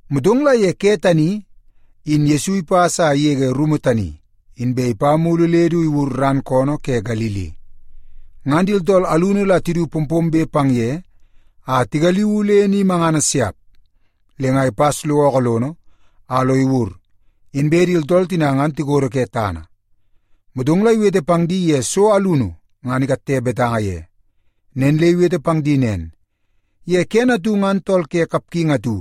Motong la ye ke tani in Yesu ipas a igege rumu tani, inbe ipa mulu le du iwur ran koonoo ke Galili. Ngan di tooltool alunu la tidu pompombe pang ye a tigaliuu le ni mangana siap. Le nga ipas lo ookoo lono, a lo iwur, inbe di tooltool tina ngan tikodo ke tana. Motong la iwete pang di ye so alunu ngan ikatte betanga ye. Nen le iwete pang di nen, “Ye kene atu ngan tool ke kapgingi atu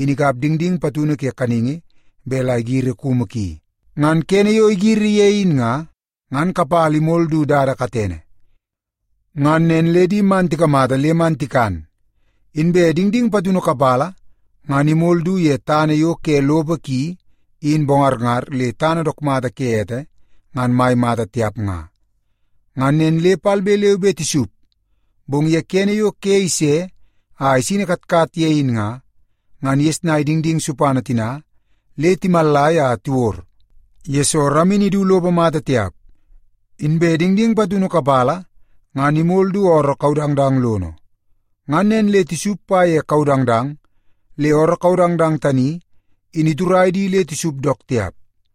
in ikap dingding patunu ke kaningi bet la igiri kumu ki. Ngan kene yo igiri ye in nga, ngan kapala imol du dada katene. Ngan nen le di man tikamata le man tikan. Inbe dingding patunu kapala ngan imol du ye tana yo ke lopo ki in bongarngar le tana dook mata ke ete ngan mai mata tiap nga. Ngan nen le palbe leu be tisup, bong ye kene yo ke ise a isini katkat ye in nga, ngan igesnai dingding supana tina le timallai a tiwod, yesoo ramini idu lopo mata tiap. Inbe dingding patunu kapala ngan imol du ooroo kaudangdang lono. Ngan nen le tisup pa ye kaudangdang le ooroo kaudangdang tani in iturai di le tisup dook tiap.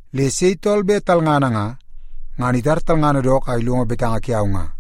Le sei tool bet talngana nga, ngan itar talngana dook a ilongo betanga kiau nga.”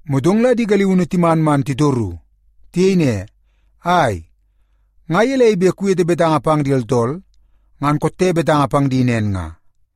Motong la di galiunu timan man titoru. Tiyei ne, “Ai, nga gelei bet kuwete betanga pang di tooltool ngan kotte betanga pang di nen nga?”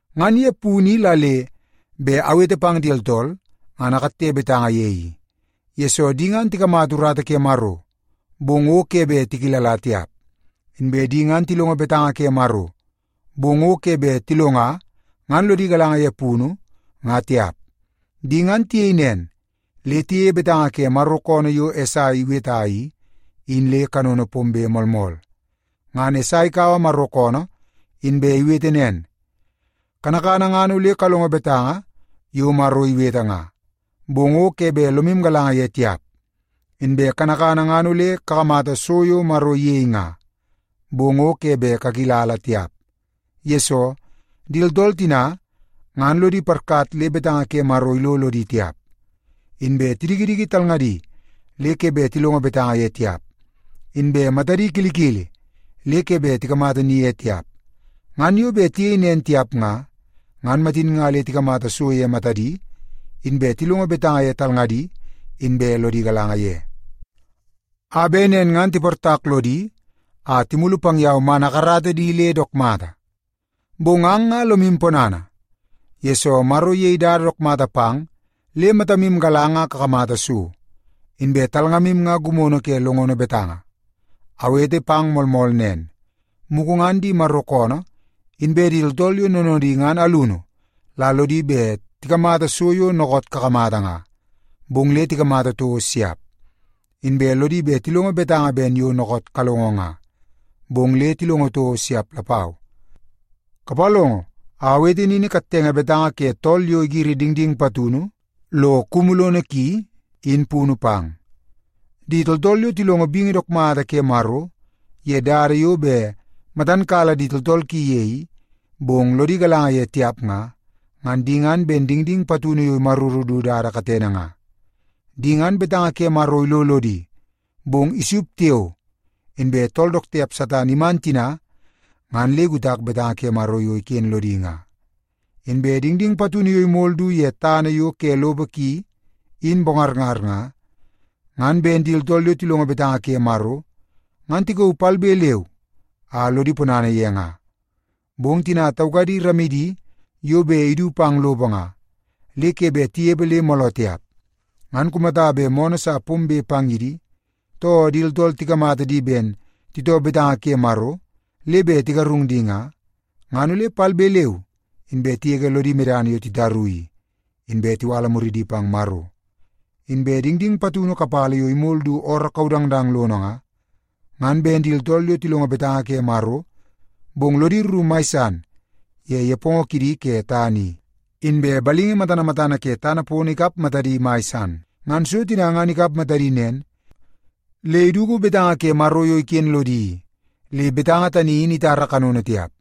Ngan ye punu i la le bet awete pang di tooltool, ngan akatte betanga ye i, yesoo di ngan tikamata urata ke Maro, bong o ke bet tikilala tiap. Inbe di ngan tilongo betanga ke Maro, bong o ke bet tilonga ngan lodi galanga ye punu nga tiap. Di ngan tiyei nen, le tiyeie betanga ke Maro koonoo Esai yo iweta i, in le kanono pombe moolmool. Ngan Esai ikaua Maro koonoo inbe iwete nen, ‘Kanakana ngan ole kalongo betanga yo Maro iwete nga, bong o ke bet lomu galanga ye tiap. Inbe kanakana ngan ole kakamata so yo Maro iyei nga, bong o ke bet kakilala tiap. Yesoo, di tooltool tina ngan lodi parkat le betanga ke Maro ilo lodi tiap, inbe tidikidiki talngadi le ke bet tilongo betanga ye tiap, inbe matadi kilikili le ke bet tikamata ni ye tiap. Ngan yo bet tiyei nen tiap nga, ngan matin nga le tikamata so ye matadi, inbe tilongo betanga ye talngadi, inbe lodi galanga ye, a bet nen ngan tiportak lodi a timulu pang yau man akarata di le dook mata.’ Bong ang nga lomu ponana, yesoo Maro iyei dada dook mata pang le matamu galanga a kakamata so, inbe talngamu nga gimono ke longono betanga. Awete pang moolmool nen, mugu ngan di Maro koonoo inbe di tooltool yo noonoodi ngan alunu la lodi bet tikamata so yo dookoot kakamata nga, bong le tikamata toko siap. Inbe lodi bet tilongo betanga ben yo dookoot kalongo nga, bong le tilongo toko siap lapau. “Kapalongo a awete nini kattenge betanga ke tool yo igiri dingding patunu lo kumu lono ki i, in punu pang. Di tooltool yo tilongo bingi dook mata ke Maro ye dada yo bet matan kala di tooltool ki ye i, bong lodi galanga ye tiap nga, ngan di ngan ben dingding patunu yo imaruru du dada katene nga. Di ngan betanga ke Maro ilo lodi, bong isup tiao, inbe tool dook tiap Satan iman tina ngan le ikutak betanga ke Maro yo iken lodi nga. Inbe dingding patunu yo imol du ye tana yo ke lopo ki in bongarngar nga, ngan ben di tooltool yo tilongo betanga ke Maro ngan tikauu palbe leu a lodi ponana ye nga. Bong tina taukadi ramidi yo bet idu pang lopo nga, le ke bet tinepe le mooloo tiap. Ngan kumata bet moonoo sa pombe pang ye di, too di tooltool tikamata di ben titoo betanga ke Maro le bet tigarung di nga, ngan ole palbe leu inbe tigege lodi medana yo titaru i, inbe tiwala muridi pang Maro. Inbe dingding patunu kapala yo imol du ooroo kaudangdang lono nga, ngan ben di tooltool yo tilongo betanga ke Maro, bong lodi rru mai san ye nepongo kidi ke tana i, inbe balingi matana matana ke tana pono ikap matadi mai san. Ngan so tina ngan ikap matadi nen, le iduku betanga ke Maro yo iken lodi i, le betanga tani in itara kanono tiap.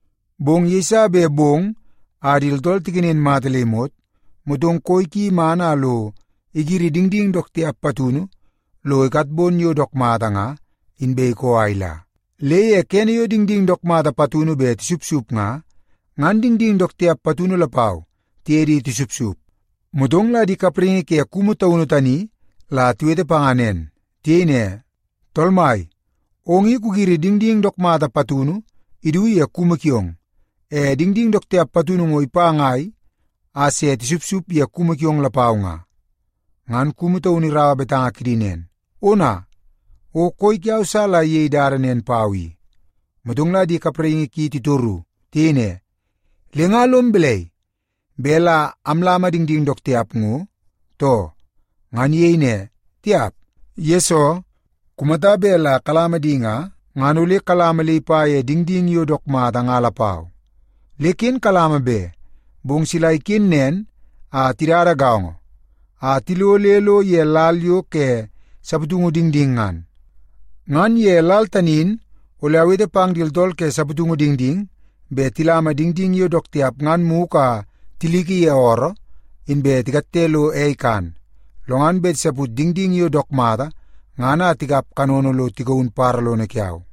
Bong yeiso bet bong a di tooltool tikenen mata le imot, motong koi ki iman a lo igiri dingding dook tiap patunu lo ikatbon yo dook mata nga, inbe ikoo a ila. Le ye kene yo dingding dook mata patunu bet tisupsup nga, ngan dingding dook tiap patunu lapau tiye di tisupsup. “Motong la di kapraingi ke kumu taunu tani la tiwete panga nen. Tiyei ne, ‘Tool mai, ong i kugiri dingding dook mata patunu idu ye kumu kiong, e dingding dook tiap patunu ngo ipa ngai a se tisupsup ye kumu kiong lapau nga?’ “Ngan kumu taunu iraua betanga kidi nen, ‘Ona, o koi kiau sa la iyei dada nen pau i.’ “Motong la di kapraingi ki titoru. Tiyei ne, ‘Le nga lom balai, bet la amlama dingding dook tiap ngo, too?’ “Ngan iyei ne, ‘Tiap. Yesoo, kumata bet la kalama di nga, ngan ole kalama le ipa ye dingding yo dook mata nga lapau. Le ken kalama be, bong sila tiken nen a tidada gaongo a tilo le lo ye lal yo ke saputungu dingding ngan. Ngan ye lal tani in ole awete pang di tooltool ke saputungu dingding bet tilama dingding yo dook tiap ngan mugu a tiliki ye ooroo, inbe tikatte lo ei ikan. Lo ngan bet tisaput dingding yo dook mata ngan a tikap kanono lo tigaun badabada lono kiau.’”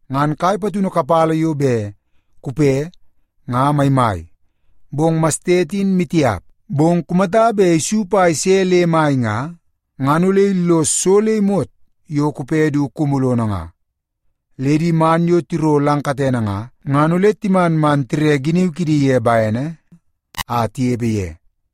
Ngan kai patunu kapala yo bet kupe nga maimai, bong mastet in maitiap. Bong kumata bet isup a ise le mai nga, ngan ole illos so le imot yo kupe du kumu lono nga. Le di man yo tiro lang katene nga, ngan ole timan man tire giniu kidi ye bene a tinepe ye.”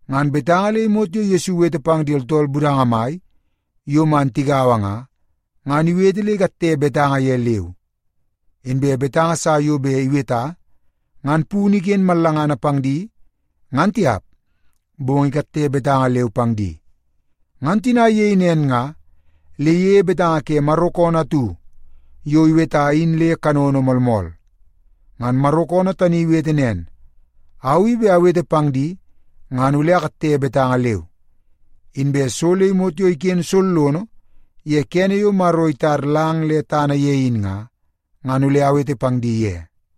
Ngan betanga le imot yo Yesu iwete pang di tooltool budanga mai yo man tigaua nga, ngan iwete le ikatte betanga ye leu. Inbe betanga sa yo bet iweta ngan punu iken mallangana pang di ngan tiap, bong ikatte betanga leu pang di. Ngan tina iyei nen nga, le iyeie betanga ke Maro koonoo atu yo iweta in le kanono pombe moolmool. Ngan Maro koonoo tani iwete nen, “Au i bet awete pang di, ngan ole akatte betanga leu. Inbe so le imot yo iken sollono ye kene yo Maro itar lang le tana ye in nga, ngan ole awete pang di ye.”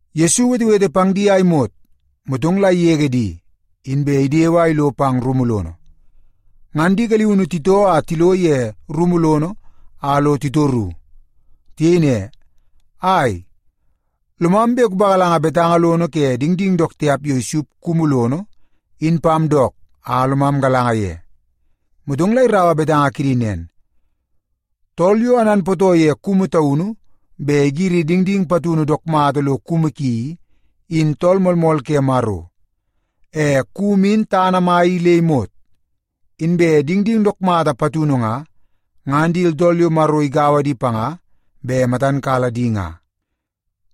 Yesu iwetewete pang di a imot, motong la igege di, inbe idewe a ilo pang rumu lono. Ngan di galiunu titoo a tilo ye rumu lono a lo titoru. Tiyei ne, “Ai, lomam bet kupagalanga betanga lono ke dingding dook tiap yo isupsup kumu lono in pam dook a lomam galanga ye.” Motong la iraua betanga kidi nen, “Tool yo ananpootoo ye kumu taunu bet igiri dingding patunu dook mata lo kumu ki i, in Tool Moolmool ke Maro. E kumu in tana mai i le imot. Inbe dingding dook mata patunu nga, ngan di tooltool yo Maro igaua di panga bet matan kala di nga.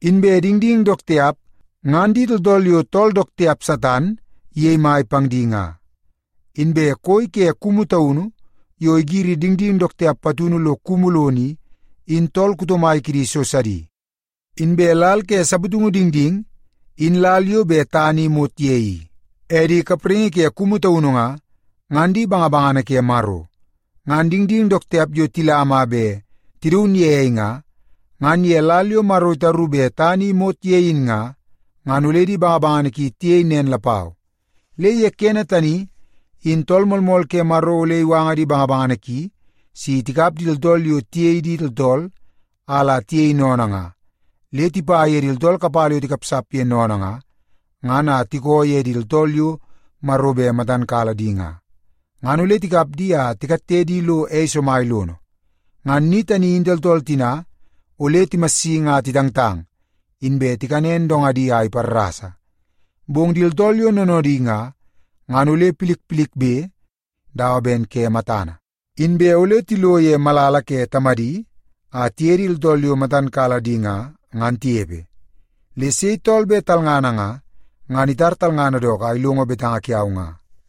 Inbe dingding dook tiap, ngan di tooltool yo tool dook tiap, Satan, iyei mai pang di nga. Inbe koi ke kumu taunu yo igiri dingding dook tiap patunu lo kumu lono i, in tool kuto mai kidi so sidi. Inbe lal ke saputungu dingding, in lal yo bet tana i imot ye i. E di kapraingi ke kumu taunu nga, ngan di bangabangana ke Maro. Ngan dingding dook tiap yo tilama a bet tidaun ye ei nga, ngan ye lal yo Maro itaru bet tana i imot ye in nga, ngan ole di bangabangana ki tiyei nen lapau. Le ye kene tani in Tool Moolmool ke Maro ole iwanga di bangabangana ki si tikap di tooltool yo tiyei di tooltool a la tiyei sennene nga, le tipa ye di tooltool kapala yo tikapsap ye sennene nga, ngan a tikoo ye di tooltool yo Maro bet matan kala di nga. Ngan ole tikap di a tikatte di lo ei somai lono. Ngan ni tani in di tooltool tina ole timassingi a titangtang, inbe tikanen dongadi a iparrasa. Bong di tooltool yo noonoodi nga, ngan ole milmilbe dawa ben ke matana, inbe ole tilo ye malala ke Tamadi a tiye di tooltool yo matan kala di nga, ngan tinepe. Le sei tool bet talngana nga, ngan itar talngana dook a ilongo betanga kiau nga.”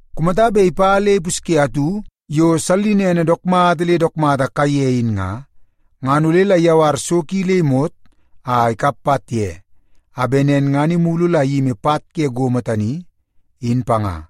Kumata bet ipa le ipusye atu yo sallinene dook mata le dook mata kaiye in nga, ngan ole la iyawar so ki le imot a ikap pat ye, a bet nen ngan imulu la iyimi pat ke gomo tani, in panga.”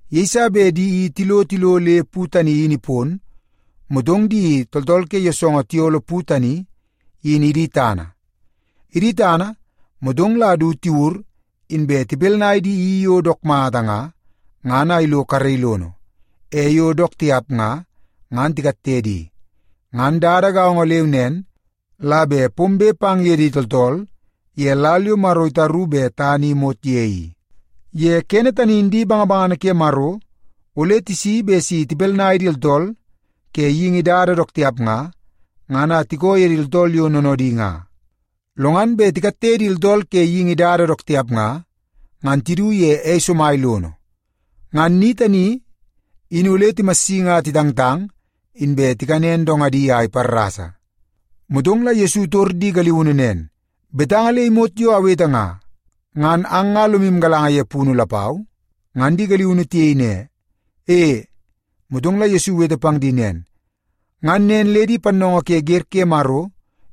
Yeiso bet di i tilo tilo le pu tani in ipon, motong di tooltool ke yoosoongoo tiyolo pu tani in idi tana. Idi tana, motong la du tiwur, inbe tipinai di i yo dook mata nga, ngan a ilo karei lono. E yo dook tiap nga, ngan tikatte di. Ngan dada gaongo leu nen la bet pombe pang ye di tooltool ye lal yo Maro itaru bet tana i imot ye i. Ye kene tani in di bangabangana ke Maro ole tisi bet si tipinai di tooltool ke geingi dada dook tiap nga, ngan a tikoo ye di tooltool yo noonoodi nga. Lo ngan bet tikatte di tooltool ke geingi dada dook tiap nga, ngan tidu ye ei somai lono. Ngan ni tani in ole timassingi a titangtang, inbe tikanen dongadi a iparrasa.” Motong la Yesu itor di galiunu nen, “Betanga le imot yo awete nga, ngan ang nga lomu galanga ye punu lapau?” Ngan di galiunu tiyei ne, “E.” Motong la Yesu iwete pang di nen, “Ngan nen le di pannoongoo ke wer ke Maro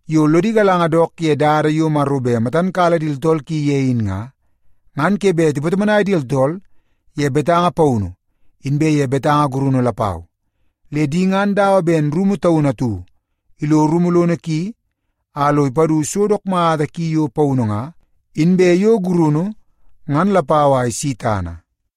yo lodi galanga dook ye dada yo Maro bet matan kala di tooltool ki ye in nga, ngan ke bet tipatomonai di tooltool ye betanga paunu inbe ye betanga gurunu lapau. Le di ngan dawa ben rumu taunu atu ilo rumu lono ki a lo ipadu so dook mata ki yo paunu nga, inbe yo gurunu ngan lapau a isi tana.”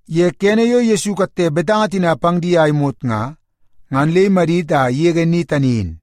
Ye kene yo Yesu ikatte betanga tina ngan pang di a imot nga, ngan le imadit a igege ni tani in.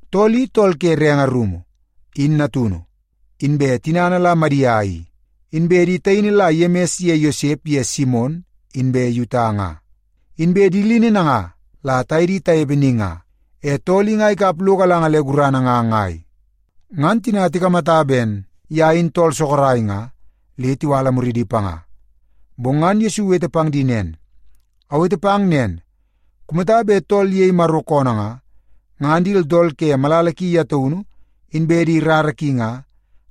Tool i, tool ke renge rumu, in natunu. Inbe tinana la Madia i. Inbe di taini la Yemis ye Yosep ye Simon inbe Yuta nga. Inbe di lini nanga la taye di tanepe ni nga. E tool i nga ikap lo galanga le gurana nga ngai?” Ngan tina tikamata ben ye in tool sorok nga, le tiwala muridi panga. Bong ngan Yesu iwete pang di nen, “Awete pang nen, kumata bet tool iyei Maro koonoo nga, ngan di tooltool ke malala ki ye taunu inbe di rara ki nga,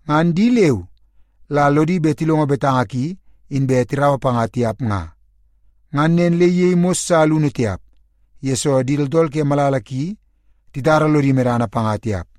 ngan di leu la lodi bet tilongo betanga ki inbe tiraua panga tiap nga.” Ngan nen le iyei mos sa alunu tiap, yesoo di tooltool ke malala ki titara lodi medana panga tiap.